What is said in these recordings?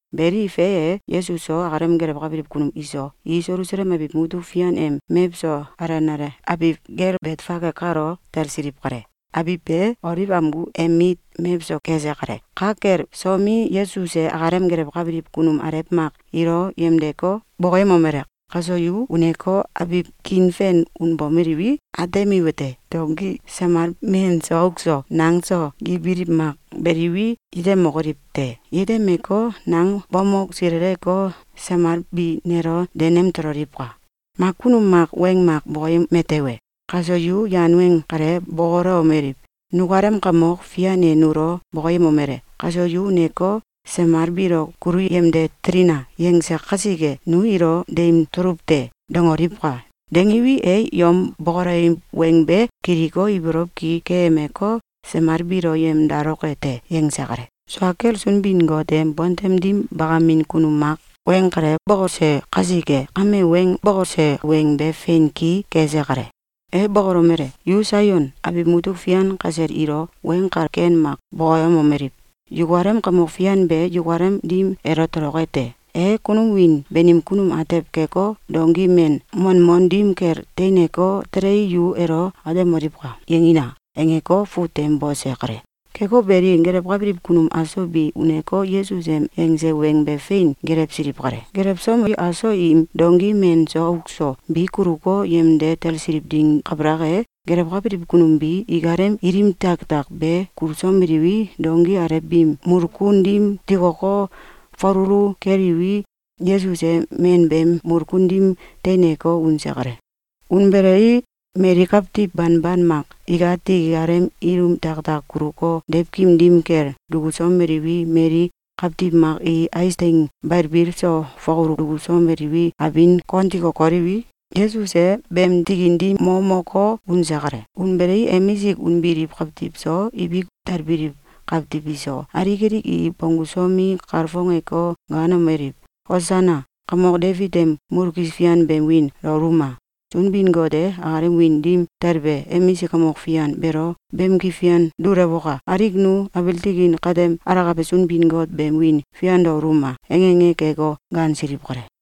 Beli, fe e, Yesus so, akalem gelewkabiliw kunum iso, i Selusalem abiw mutuk fian em mewso alenale abiw gel Betfage kalo talsiliw kale. Abiw be Oliw amgu em mit mewso kese kale. Ka kel somi, Yesus e akalem gelewkabiliw kunum alew mak ilo yemdeko, bokoyemomele: “Kaso yu uneko, abiw kiin fen unbomeliwi, atemiwete: Donki samal men so auk so nang so gibiliw mak beliwi, yetemokoliw te. Yetemeko, nang bamok sileleko, samal bi nelo denem tololiwka! Mak kunum mak weng mak bokoyeme tewe, kaso yu yan weng kale bokolewomeliw: ‘Nukalem Kamok Fian e nulo bokoyemolele: ‘Kaso yu uneko, samal biilo kulu yemde telina!’, yangse kasike, nu ilo deim tuluw te.’, dangoliwka! Dangiwi, e yom bokolewiw weng be kiliko, ibolow ki keyemeko, samal biilo yemdaloke te.”, yangse kale. Sua kel Sunbin-Got em bontem dim bakamin kunum mak weng kale bokose kasike, kame weng bokose weng be fein ki kese kale. E bokolomele: “Yu Saion abiw mutuk fian kasel ilo weng kal ken mak bokoyemomeliw: ‘Yukalem Kamok Fian be yukalem dim elo toloke te! E kunum wiin banim kunum atew keko, donki men manmon dim kel teineko, telei, yu elo atemoliwka!’, yangina!”, angeko, fut tem bose kale. Keko beli, gelewkabiliw kunum aso bi uneko, Yesus em yangse weng be fein gelewsiliw kale. Gelewsomi, aso im donki men so auk so bi kuluko, yemde tasliliw ding kabalak e, gelewkabiliw kunum bi ikalem ilim tiaktiak be gulusomeliwi, donki alew biim mulkun dim tikoko, falulu keliwi, Yesus e men beem mulkun dim teineko, unse kale. Unbelei, mali kawtiw banban mak ikati ikalem ilim tiaktiak guluko, deiwkim dim kel dukusomeliwi, mali kawtiw mak i ais teing balbil so fakulu dukusomeliwi, abin kon tiko koliwi, Yesus e beem tikin dim mo moko, unse kale. Unbelei, emisik unbiliw kawtiw so, ibik talbiliw kawtiw iso, alik alik i bonggusomi, kalfongeko, gaanomeliw: “Osana! Kamok Debit em mulkis fian beem wiin daoluma! Sunbin-Got e akalem wiin dim talbe emisik kamok fian beelo bamki fian dulewoka! Alik nu abiil tikin katem alakabe Sunbin-Got beem wiin fian daoluma!”, ange ange keko, gaansiliw kale.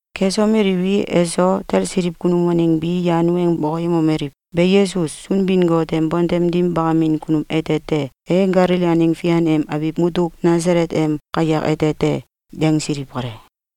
Kesomeliwi, eso talsiliw kunum waeng bi yan weng bokoyemomeliw: “Be Yesus, Sunbin-Got em bontem dim bakamin kunum ete te. E Galili aneng fian em abiw mutuk Nasalet em kayak ete te.”, yangsiliw kale.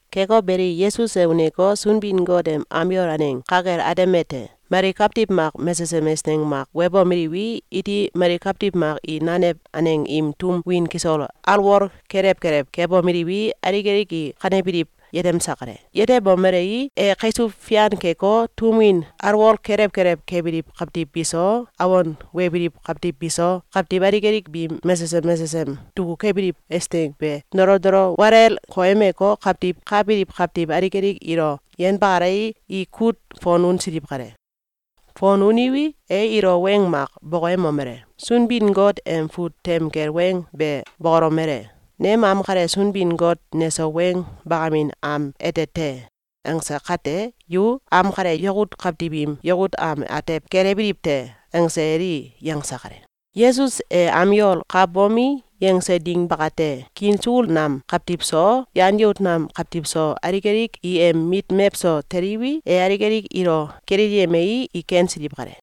Keko beli, Yesus e uneko, Sunbin-Got em am yol aneng ka kel atemete: Mali kawtiw mak mesesem eisneng mak webomeliwi, iti mali kawtiw mak i nanew aneng im tum win kisol alwol kelew kelew kebomeliwi, alik alik i kanebiliw, yetemse kale. Yetemomelei, e kaisuw fian keko, tum win alwol kelew kelew kebiliw kawtiw biso, awon webiliw kawtiw biso, kawtiw alik alik biim mesesem mesesem dukukebiliw eisneng be dolo dolo walel koyemeko, kawtiw ka biliw kawtiw alik alik ilo yenbakalei, i kut fon unsiliw kale. Fon uniwi, e ilo weng mak bokoyemomele: “Sunbin-Got em fut tem kel weng be bokolomele: ‘Nem am kale Sunbin-Got neso weng bakamin am ete te.’, angse kate, yu ‘Am kale yakut kawtiw im yakut am atew kelewbiliw te!’, angse eli!”, yangse kale. Yesus e am yol ka bomi, yangse ding bakate, kiin sukul nam kawtiw so, yan yout nam kawtiw so, alik alik i em mit mewso teliwi, e alik alik ilo kilelyemei, i kensiliw kale.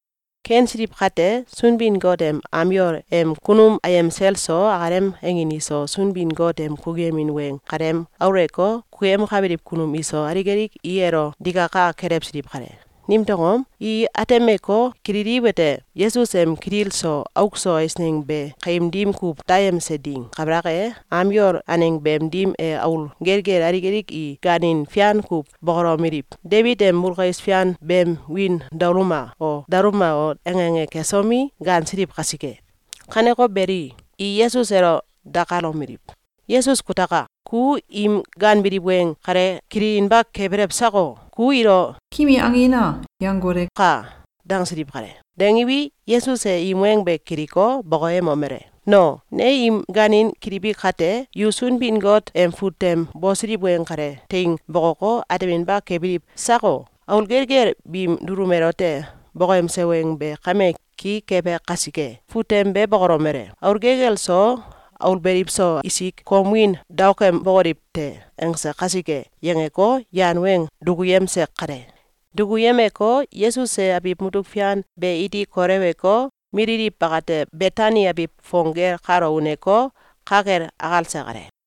Kensiliw kate, Sunbin-Got em am yol em kunum ayem sel so, akalem angin iso, Sunbin-Got em kukuyemin weng kalem aulewko, kukuyemkabiliw kunum iso, alik alik i elo digaka kelewsiliw kale. Nimtew angom? I atemeko, kililiwete: Yesus em kitil so auk so eisneng be kaim dim kuw dayemse ding kabalak e, am yol aneng beem dim e aul gelgel alik alik i gaanin fian kuw bokolomeliw: “Debit em mulkis fian beem wiin daoluma o! Daoluma!”, ange ange kesomi, gaansiliw kasike. Kaneko beli, i Yesus elo dakalomeliw: “Yesus kutaka! Ku im gaanbiliw weng kale kililinba kebelw sako? Ku ilo ‘Kimi angina!’, yangoleka!”, dangsiliw kale. Dangiwi, Yesus e im weng be kiliko, bokoyemomele: “No, ne im gaanin kilibi kate, yu Sunbin-Got em fut tem bosiliw weng kale teing bokoko, ateminba kebiliw sako? Aul gelgel biim dulum elote bokoyemse weng be kame ki kebe kasike. Fut tem be bokolomele: ‘Aul gelgel so, aul beliw so, isik kom wiin daokembokoliw te.’, angse kasike!”, yangeko, yan weng dukuyemse kale. Dukuyemeko, Yesus e abiw mutuk fian be iti koleweko, mililiw bakate Betani abiw fong gel kalo uneko, ka kel akalse kale.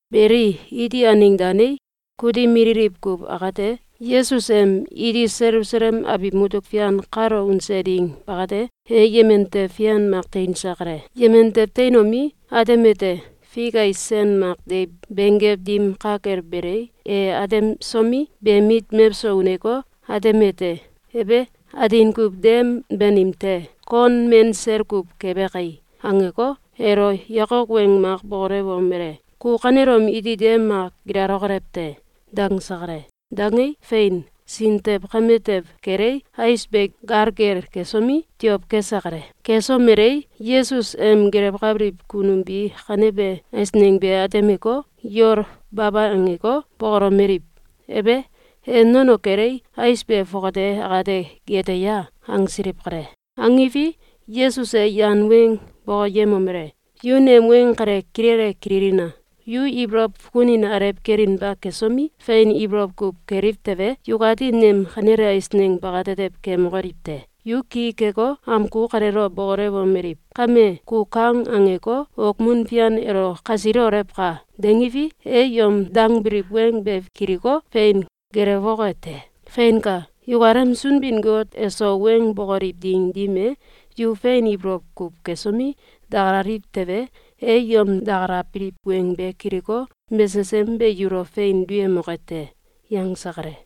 Beli, iti aneng danei, kutim mililiw kuw akate, Yesus em iti Selusalem abiw mutuk fian kalo unse ding bakate, e yemen tew fian mak teinse kale. Yemen tew teinomi, atemete: Fik ais sen mak deiw benggew dim ka kel belei, e atemsomi, beem mit mewso uneko, atemete: “Ebe! Atin kuw dem banim te! Kon men sel kuw kebe kai!”, angeko, elo yakok weng mak bokolewomele: “Ku kanelom iti dem mak gilalokolew te!”, dangse kale. Dangei, fein, sin tew kame tew kelei, ais be galgel kesomi, tiow kese kale. Kesomelei, Yesus em gelewkabiliw kunum bi kanebe eisneng be atemeko, yol baba angeko, bokolomeliw: “Ebe! E nono kelei, ais be fongate akate gete ya?”, angsiliw kale. Angiwi, Yesus e yan weng bokoyemomele: “Yu nem weng kale kilele kililina! Yu ibolow fukunin alew kelinba kesomi, fein ibolow kuw keliw tewe, yukati nem kanele eisneng bakatetew kemokoliw te! Yu ki keko, amgu kaleelo bokolewomeliw: ‘Kame, ku kang angeko, okmun fian elo kasilolewka!’, dangiwi, e yom dangbiliw weng be kiliko, fein gelewoke te. Feinka! Yukalem Sunbin-Got eso weng bokoliw ding dim e, yu fein ibolow kuw kesomi, dakalaliw tewe, e yom dakalabiliw weng be kiliko, mesesem be yulo fein duyemoke te!”, yangse kale.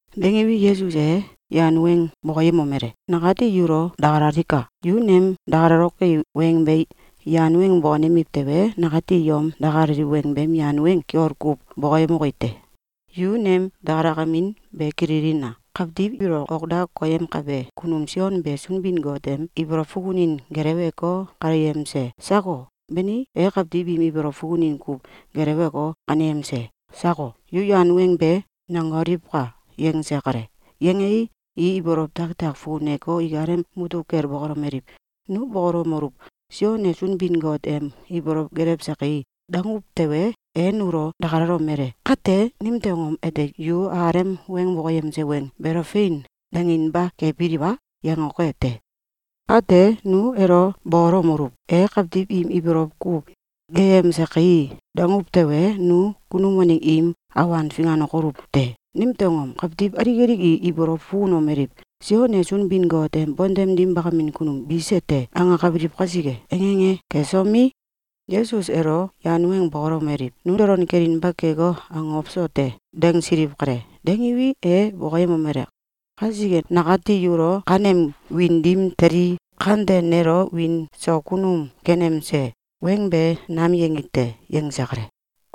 Dangiwi, Yesus e yan weng bokoyemomele: “Nakati yulo dakalalika! Yu nem dakalaloki weng be yan weng bokonemiw tewe, nakati yom dakalaliw weng beem yan weng kiol kuw bokoyemoki te. Yu nem dakalakemin be kililina! Kawtiw ilo ok da koyemkebe kunum Sion be Sunbin-Got em ibolow fukunin geleweko, kaneyemse sako? Bani, e kawtiw im ibolow fukunin kuw gelewko, kaneyemse sako? Yu yan weng be nangoliwka!”, yangse kale. Yangei, i ibolow tiaktiak fukuneko, ikalem mutuk kel bokolomeliw: “Nu bokolomeluw: ‘Sion e Sunbin-Got em ibolow gelewse kai!’, danguw tewe, e nulo dakalalomele: ‘Kate, nimtew angom ete yu akalem weng bokoyemse weng beelo ‘Fein!’, danginba kebiliw a?’, yangoke te. Kate, nu elo bokolewomeluw: ‘E kawtiw im ibolow kuw geyemse kai!’, danguw tewe, nu kunum waneng im awan finganokoluw te. Nimtew angom? Kawtiw alik alik i ibolow fukunomeliw: ‘Sion e Sunbin-Got em bontem dim bakamin kunum bise te!’, angakabiliw kasike!”, ange ange kesomi, Yesus elo yan weng bokolewomeliw: “Nu dolon kelinba keko, akokow so te!”, dangsiliw kale. Dangiwi, e bokoyemomele: “Kasike nakati yulo ‘Kanem wiin dim telii, kante nelo wiin so kunum kenemse!’ weng be nam yangi te!”, yangse kale.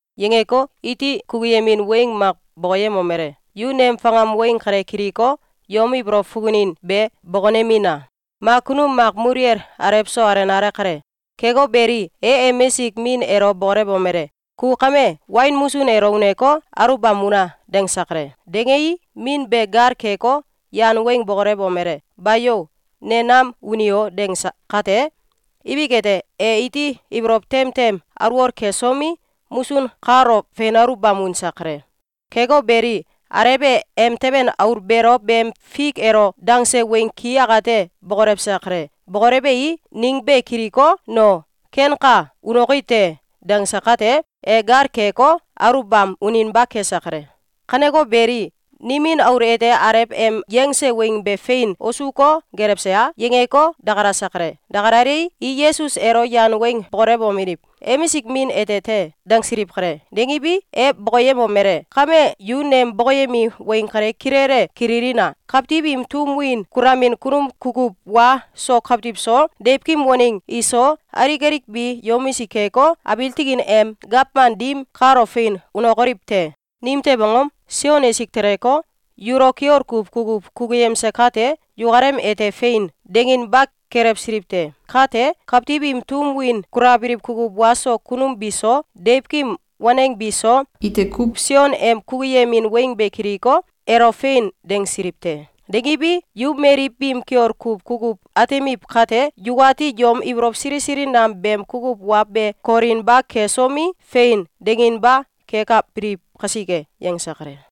Yangeko, iti kukuyemin weng mak bokoyemomele: “Yu nem fakam weng kale kiliko, yom ibolow fukunin be bokonemina! Mak kunum mak muluwel alew so alenale kale. Keko beli, e emisik min elo bokolewomele: ‘Ku kame wain musun elo uneko, aluwbam una!’, dangse kale. Dangei, min be gal keko, yan weng bokolewomele: ‘Bayo! Ne nam uni o!’, dangse kate, ibik ete, e iti ibolow tem tem alwol kesomi, musun kalo fein aluwbam unse kale. Keko beli, alew e emteben aul beelo beem fik elo dangse weng ki akate bokolewse kale. Bokolewei, ning be kiliko, ‘No, kenka. Unoki te.’, dangse kate, e gal keko, aluwbam uninba kese kale. Kaneko beli, nimin aul ete alew em yangse weng be fein wosuko, gelewse a?”, yangeko, dakalase kale. Dakalalei, i Yesus elo yan weng bokolewomeliw: “Emisik min ete te!”, dangsiliw kale. Dangiwi, e bokoyemomele: “Kame yu nem bokoyemi weng kale kilele kililina! Kawtiw im tum win kulamin kunum kukuw wa so kawtiw so, deiwkim weneng iso, alik alik bi yomisik keko, abiil tikin em gawman dim kalo fein unokoliw te! Nimtew angom? Sion esik teleko, yulo kiol kuw kukuw kukuyemse kate, yukalem ete ‘Fein!’, danginba kelewsiliw te. Kate, kawtiw im tum win kulabiliw kukuw wa so kunum biso, deiwkim waneng biso, ite kuw Sion em kukuyemin weng be kiliko, elo ‘Fein!’, dangsiliw te. Dangiwi, yu mali biim kiol kuw kukuw atemiw kate, yukati yom ibolow sili sili nam beem kukuw wa be kolinba kesomi, ‘Fein!’, danginba kekabiliw kasike.”, yangse kale.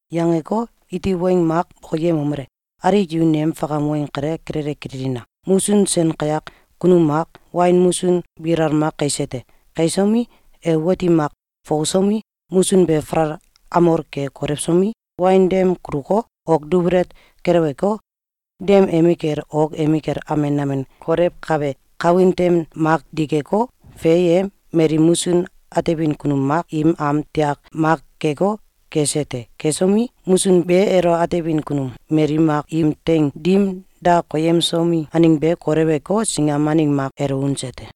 Yangeko, iti weng mak bokoyemomele: “Alik yu nem fakam weng kale kilele kililina! Musun sen kayak kunum mak wain musun bilal mak kaise te. Kaisomi, e wati mak fokosomi, musun be falal amol ke kolewsomi, wain dem kuluko, ok dubelet keleweko, dem emikel ok emikel amen amen kolewkabe kawin tem mak dikeko, fe e, mali musun atemin kunum mak im am tiak mak keko, gese te. Gesomi, musun be elo atebin kunum mali mak im teing dim da koyemsomi, aneng be koleweko, singam aneng mak elo unse te.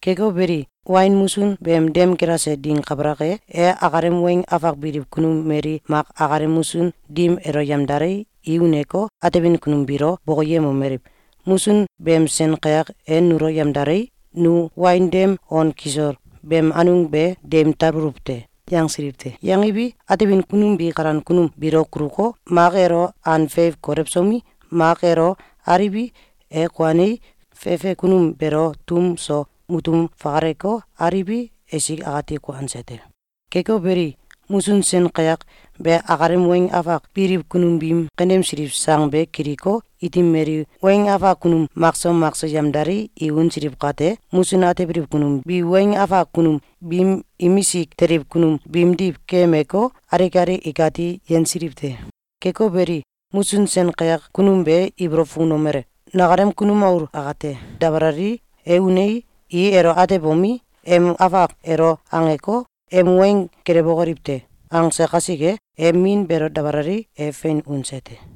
Keko beli, wain musun beem dem gilase ding kabalak e, e akalem weng afak biliw kunum mali mak akalem musun dim elo yemdalei, i uneko, atebin kunum biilo bokoyemomeliw: ‘Musun beem sen kayak e nulo yemdalei, nu wain dem on kisol beem anung be deim talbuluw te.’, yangsiliw te. Yangiwi, atebin kunum bi kalan kunum biilo kuluko, mak elo an feiw kolewsomi, mak elo aliwi, e kuanei, fefe kunum beelo tum so mutum fakaleko, aliwi, esik akati kuanse te. Keko beli, musun sen kayak be akalem weng afak biliw kunum biim kaneyemsiliw sang be kiliko, iti mali weng afak kunum makso makso yemdalei, i unsiliw kate, musun atebiliw kunum bi weng afak kunum biim imisik teliw kunum biimdiw keyemeko, alik alik ikati yensiliw te. Keko beli, musun sen kayak kunum be ibolow fukunomele: ‘Nakalem kunum aul akate dabalalii, e unei, i elo atebomi, em afak elo angeko, em weng gelewokoliw te!’, angse kasike, e min beelo dabalalei, e fein unse te.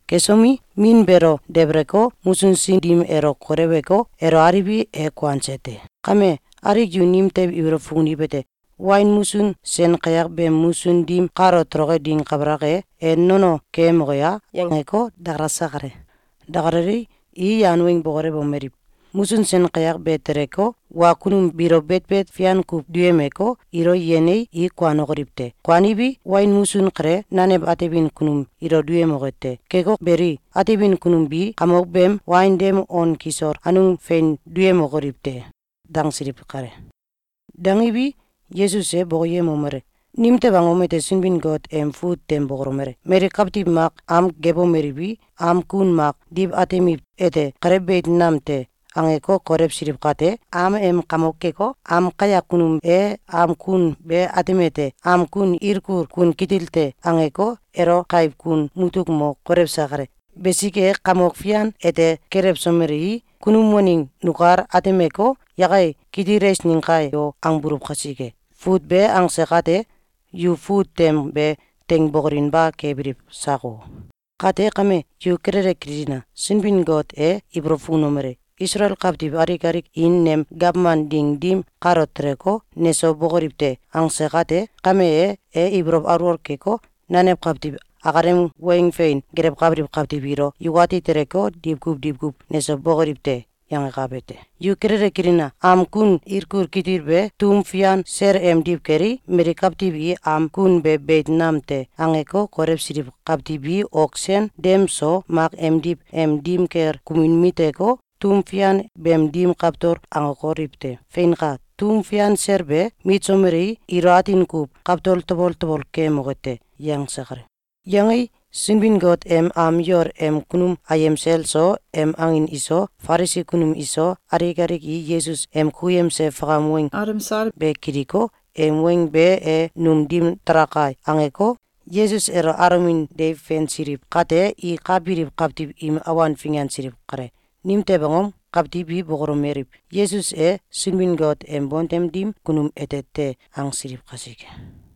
Kesomi, min beelo debeleko, musun sin dim elo koleweko, elo aliwi, e kuanse te. Kame, alik yu nimtew ibolow fukuniwete: Wain musun sen kayak beem musun dim kalo toloke ding kbalak e, e nono keyemoke a?”, yangeko, dakalase kale. Dakalalei, i yan weng bokolewomeliw: “Musun sen kayak be teleko, wa kunum biilo betbet fian kuw duyemeko, ilo yenei, i kuanokoliw te. Kuaniwi, wain musun kale, nanew atebin kunum ilo duyemoke te. Keko beli, atebin kunum bi kamok beem wain dem on kisol anung fein duyemokoliw te.”, dangsiliw kale. Dangiwi, Yesus e bokoyemomele: “Nimtew angom ete Sunbin-Got em fut tem bokolomele: ‘Mali kawtiw mak am gebomeliwi, am kun mak diw atemiw ete, ‘Kale beit nam te!’, angeko, kolewsiliw kate, am em kamok keko, am kayak kunum e am kun be atemete: ‘Am kun ilkul kun kitil te!’, angeko, elo kaiw kun mutuk mo kolewse kale. Besike, Kamok Fian ete kelewsomelei, kunum waneng nukal atemeko, ‘Yakai! Kitil eisneng kai o!’, angbuluw kasike.’, fut be angse kate, yu fut tem be teing bokolinba kebiliw sako? Kate kame, yu kilele kililina! Sunbin-Got e ibolow fukunomele: ‘Isalael kawtiw alik alik i nem gawman ding dim kalo teleko, neso bokoliw te!’, angse kate, kame e, e ibolow alwol keko, nanew kawtiw akalem weng fein gelewkabiliw kawtiw ilo ‘Yukati teleko, diwkuw diwkuw neso bokoliw te!’, yangakabe te. Yu kilele kililina! Am kun ilkul kitil be tum fian sel emdiw kelei, mali kawtiw i ‘Am kun be beit nam te!’, angeko, kolewsiliw kawtiw bi ok sen dem so mak emdiw em dim kel kumin miteko, tum fian beem dim kawtol angokoliw te. Feinka! Tum fian sel be mitsomelei, ilo atin kuw kawtol tabol tabol keyemoke te.”, yangse kale. Yangei, Sunbin-Got em am yol em kunum ayem sel so, em angin iso, Falisi kunum iso, alik alik i Yesus em kukuyemse fakam weng alemsal be kiliko, ‘Em weng be e num dim dalaka!’, angeko, Yesus elo alomin deiw feinsiliw kate, i ka biliw kawtiw im awan fingansiliw kale. Nimtew angom? Kawtiw bi bokolomeliw: “Yesus e Sunbin-Got em bontem dim kunum ete te!”, angsiliw kasike.